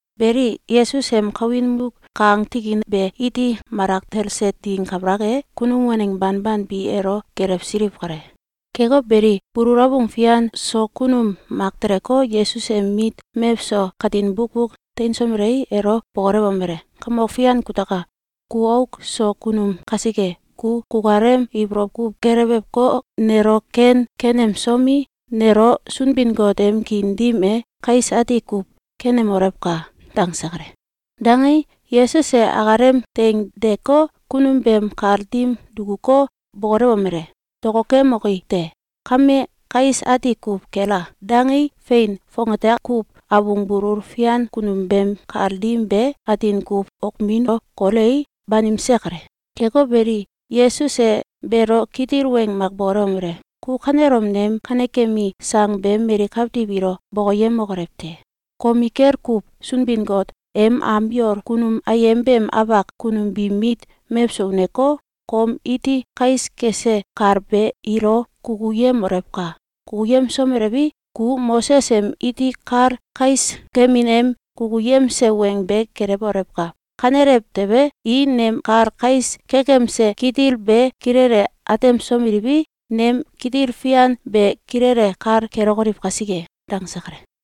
Beli, Yesus em kawin muk kang tikin be iti malak talse ding kabalak e, kunum waneng banban bi elo gelewsiliw kale. Keko beli, bulul abung fian so kunum mak teleko, Yesus em mit mewso katin bukbuk teinsomelei, elo bokolewomele: “Kamok Fian kutaka! Ku auk so kunum kasike, ku kukalem ibolow kuw gelewewko, nelo ken kenemsomi, nelo Sunbin-Got em kiin dim e kais ati kuw kenemolewka!”, dangse kale. Dangei, Yesus e akalem teing deeko, kunum beem kal dim dukuko, bokolewomele: “Dokokemoki te! Kame kais ati kuw kela!”, dangei, fein, fongate kuw abung bulul fian kunum beem kal dim be atin kuw okmino kolei, banimse kale. Keko beli, Yesus e beelo kitil weng mak bokolewomele: “Ku kanelom nem kanekemi sang be mali kawtiw ilo bokoyemokolew te! Komikel kuw Sunbin-Got em am yol kunum ayem beem afak kunum biim mit mewso uneko, kom iti kais kese kal be ilo kukuyemolewka! Kukuyemsomelewi, ku Moses em iti kal kais kemin em kukuyemse weng be gelewolewka! Kanelew tewe, i nem kal kais kekemse kitil be kilele atemsomeliwi, nem kitil fian be kilele kal kelokoliw kasike.”, dangse kale.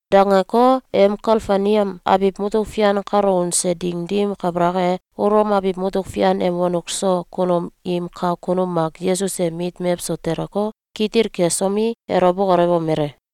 Dangeko, em Kafelneam abiw mutuk fian kalo unse ding dim kabalak e, Ulom abiw mutuk fian em wonuk so kunum im kak kunum mak Yesus em mit mewso teleko, kitil kesomi, elo bokolewomele: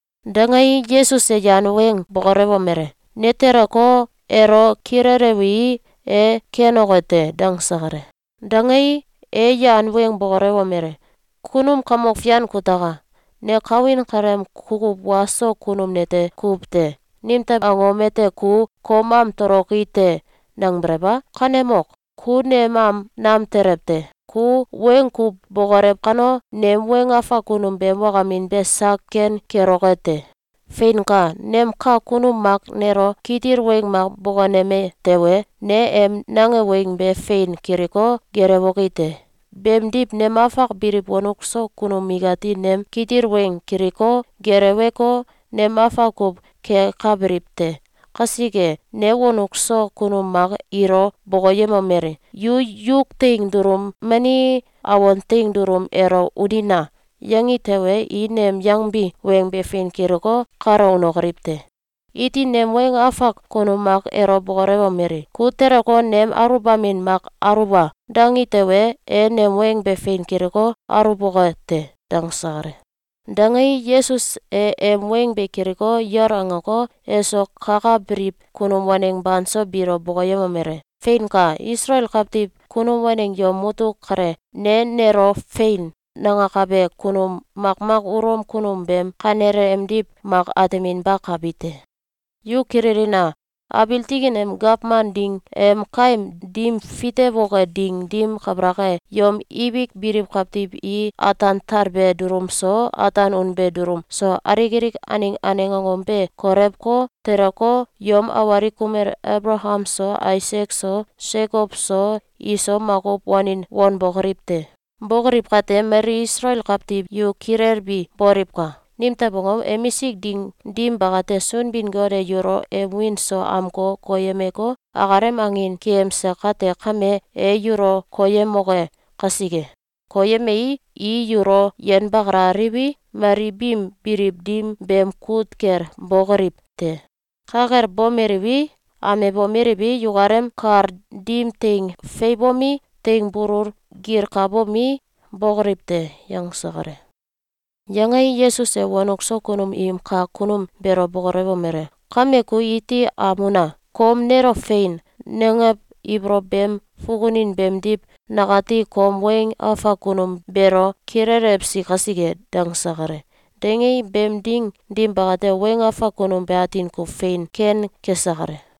Dangei, Yesus e yan weng bokolewomele: “Ne teleko, elo kilelewii, e kenoke te.”, dangse kale. Dangei, e yan weng bokolewomele: “Kunum kamok fian kutaka! Ne kawin kaleem kukuw wa so kunum nete kuw te. Nimtew angom ete ku ‘Kom am toloki te!’, nangbelew a? Kanemok! Ku nem am nam telew te. Ku weng kuw bokolew kano, nem weng afak kunum beem wakamin be sak ken keloke te. Feinka! Nem kak kunum mak nelo kitil weng mak bokoneme tewe, ne em nange weng be fein kiliko, gelewoki te. Beemdiw, nem afak biliw wonuk so kunum ikati nem kitil weng kiliko, geleweko, nem afak kuw kekabiliw te. Kasike, ne wonuk so kunum mak ilo bokoyemomeli: ‘Yu yuk teing dulum mani awan teing dulum elo unina!’, yangi tewe, i nem yangbi weng be fein kiliko, kalo unokoliw te. Iti nem weng afak kunum mak elo bokolewomeli: ‘Ku teleko, nem aluwbamin mak aluwa!’, dangi tewe, e nem weng be fein kiliko, aluwboke te.”, dangse kale. Dangei, Yesus e em weng be kiliko, yol angeko, eso kakabiliw kunum waneng banso biilo bokoyemomele: “Feinka! Isalael kawtiw kunum waneng yom mutuk kale, ne nelo ‘Fein!’, nangakabe kunum makmak Ulom kunum beem kanele emdiw mak ateminbakabi te. Yu kililina! Abiil tikin em gawman ding em kaim dim fitewoke ding dim kabalak e, yom ibik biliw kawtiw i ataan talbe dulum so, ataan unbe dulum so, alik alik aneng aneng angom be kolewko, teleko, yom awalik kumel Abalakam so, Aisak so, Sekow so, iso makuw wanin wanbokoliw te. Bókoliw kate, mali Isalael kawtiw yu kilelbi boliwka! Nimtew angom? Emisik ding dim bakate, Sunbin-Got e yulo em wiin so amko koyemeko, akalem angin keyemse kate kame, e yulo koyemoke kasike. Koyemei, i yulo yenbakalaliwi, mali biim biliw dim beem kut kel bokoliw te. Ka kel bomeliwi, amebomeliwi, yukalem kal dim teing feiwbomi, teing bulung gilkabomi, bókoliw te.”, yangse kale. Yangei, Yesus e wonuk so kunum im kak kunum beelo bokolewomele: “Kame ku iti am una! Kom nelo ‘Fein!’, nangew ibolow beem fukunin beemdiw nakati kom weng afak kunum beelo kilelewsi kasike.”, dangse kale. Dangei, beem ding dim bakate, weng afak kunum be atin kuw fein ken kese kale.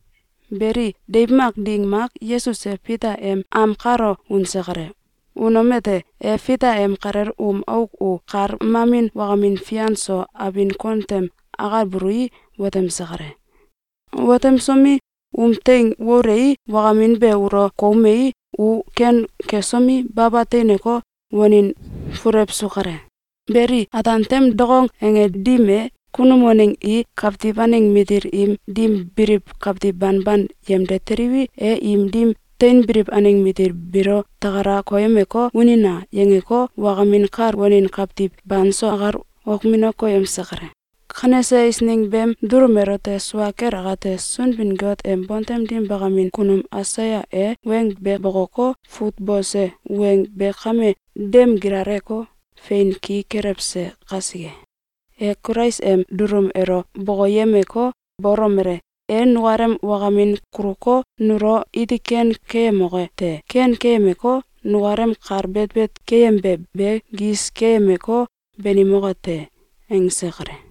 Beli, deiw mak ding mak, Yesus e Fita em am kalo unse kale. Unomete, e Fita em kalel um auk u kal mamin wakamin fian so abin kon tem akalbului, watemse kale. Watemsomi, um teing woluei, wakamin be ulo koumei, u ken kesomi, baba teineko, wanin fulewsu kale. Beli, ataan tem dokong ange dim e, kunum waneng i kawtiw aneng matil im dim biliw kawtiw banban yemde teliwi, e im dim teinbiliw aneng matil biilo “Takala koyemeko, unina!”, yangeko, wakamin kal wanin kawtiw banso akal okmino koyemse kale. Kanese eisneng beem dulum elote sua kel akate, Sunbin-Got em bontem dim bakamin kunum Aisaya e weng be bokoko, fut bose weng be kame dem gilaleko, fein ki kelewse kasike. E Kulais em dulum elo bokoyemeko, bolomele: “E nukalem wakamin kuluko, nulo iti ken keyemoke te. Ken keyemeko, nukalem kal betbet keyembe be gis keyemeko, banimoke te.”, angse kale.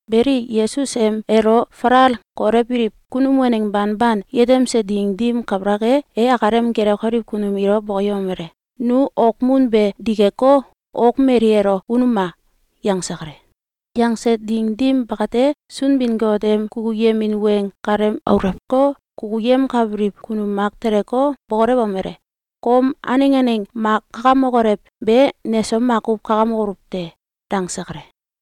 Beli, Yesus em elo falal kolewbiliw kunum waneng banban yetemse ding dim kabalak e, e akalem gelewkabiliw kunum ilo bokoyemomele: “Nu okmun be dikeko, ok mail elo unuma!”, yangse kale. Yangse ding dim bakate, Sunbin-Got em kukuyemin weng kalem aulewko, kukuyemkabiliw kunum mak teleko, bokolewomele: “Kom aneng aneng mak kakamokolew be, neso makuw kakamokoluw te.”, dangse kale.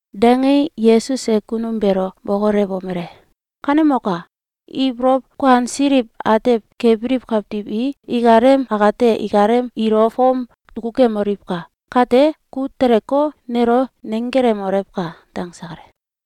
Dangei, Yesus e kunum beelo bokolewomele: “Kanemoka! Ibolow kuansiliw atew kebiliw kawtiw i ikalem akate ikalem ilo fom dukukemoliwka! Kate ku teleko, nelo nenggelemolewka!”, dangse kale.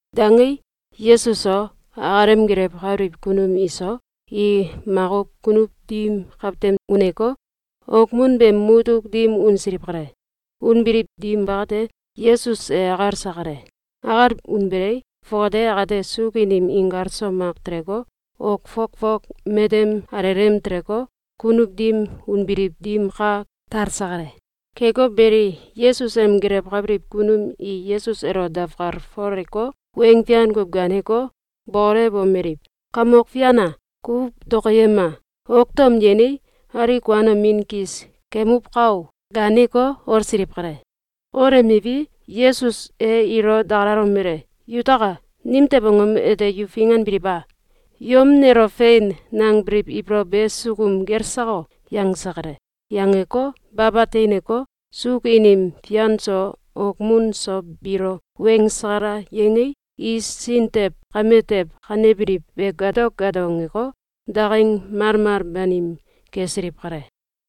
Dangei, Yesus so, akalem gelewkabiliw kunum iso, i makuw kunuw dim kawtem uneko, okmun beem mutuk dim unsiliw kale. Unbiliw dim bakate, Yesus e akalse kale. Akal unbelei, fongate akate suuk inim inkal so mak teleko, ok fok fok matem alelem teleko, kunuw dim unbiliw dim ka talse kale. Keko beli, Yesus em gelewkabiliw kunum i Yesus elo dawkalfoleko, weng fian kuw gaaneko, bokolewomeliw: “Kamok Fian a! Ku dokoyema! Ok tom yenei, alik kuanomin kis kemuwka o!”, gaaneko, olsiliw kale. Olemiwi, Yesus e ilo dakalalomele: “Yutaka! Nimtew angom ete yu finganbiliw a? Yom nelo “Fein!”, nangbiliw ibolow be sukum gel sako?”, yangse kale. Yangeko, baba teineko, suuk inim fian so okmun so biilo weng sakalal yangei, i sin tew kame tew kanebiliw be gato gato angeko, daking malmal banim kesiliw kale.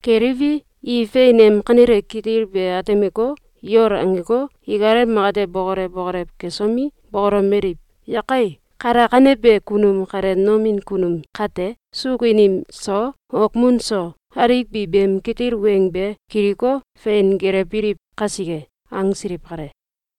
Keliwi, i fein em kanele kitil be atemeko, yol angeko, ikalem akate bokolew bokolew kesomi, bokolomeliw: “Yakai! Kalakanebe kunum kale nomin kunum kate? Suuk inim so, okmun so, alik bi beem kitil weng be kiliko, fein gelewbiliw kasike!”, angsiliw kale.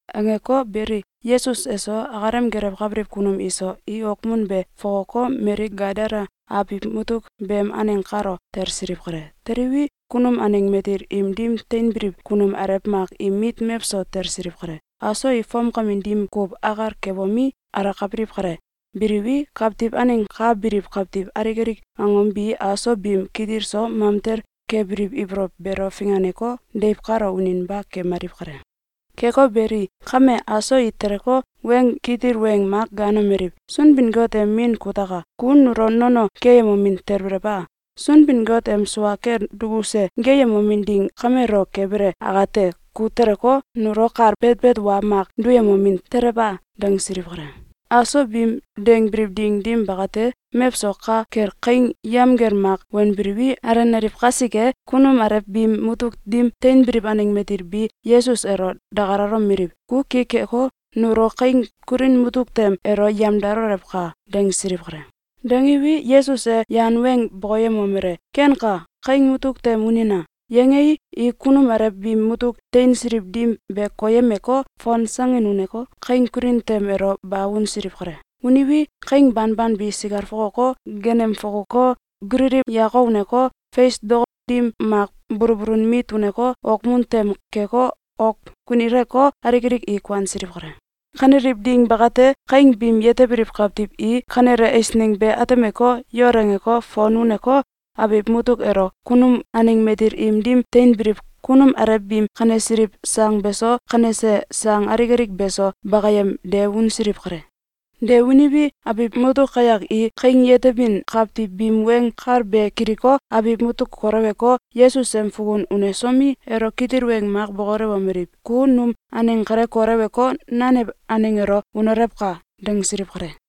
Angeko beli, Yesus eso, akalem gelewkabiliw kunum iso, i okmun be fokoko, mali Gadala abiw mutuk beem aneng kalo talsiliw kale. Teliwi, kunum aneng matil im dim teinbiliw kunum alew mak im mit mewso talsiliw kale. Aso i fomkamin dim kuw akal kebomi, alakabiliw kale. Biliwi, kawtiw aneng ka biliw kawtiw alik alik angom bi aso biim kitil so mamtel kebiliw ibolow beelo finganeko, deiw kalo uninba kemaliw kale. Keko beli, kame, aso i teleko, weng kitil weng mak gaanomeliw: “Sunbin-Got em Min kutaka! Ku nulo nono keyemomin talbelew a? Sunbin-Got em sua kel dukuse geeyemomin ding kamelo kebele akate, ku teleko, nulo kal betbet wa mak duyemomin telew a?”, dangsiliw kale. Aso biim dangbiliw ding dim bakate, mewso ka kel kaing yamgel mak wanbiliwi, alenaliw kasike, kunum alew biim mutuk dim teinbiliw aneng matil bi Yesus elo dakalalomeliw: “Ku ki keko, nulo kaing kulin mutuk tem elo yemdalolewka!”, dangsiliw kale. Dangiwi, Yesus e yan weng bokoyemomele: “Kenka! Kaing mutuk tem unina!”, yangei, i kunum alew biim mutuk teinsiliw dim be koyemeko, fonsangin uneko, kaing kulin tem elo ba unsiliw kale. Uniwi, kaing banban bi sikal fokoko, genem fukuko, gulili yako uneko, fes dok dim mak bulbulun mit uneko, okmun tem keko, ok kunileko, alik alik i kuansiliw kale. Kaneliw ding bakate, kaing biim yetebiliw kawtiw i kanele eisneng be atemeko, yol angeko, fon uneko, abiw mutuk elo kunum aneng matil im dim teinbiliw kunum alew biim kanesiliw sang beso, kanese sang alik alik beso, bakamyem de unsiliw kale. De uniwi, abiw mutuk kayak i kaing yetebin kawtiw biim weng kal be kiliko, abiw mutuk koleweko, Yesus em fukun unesomi, elo kitil weng mak bokolewomeliw: “Ku num aneng kale koleweko, nanew aneng elo unolewka!”, dangsiliw kale.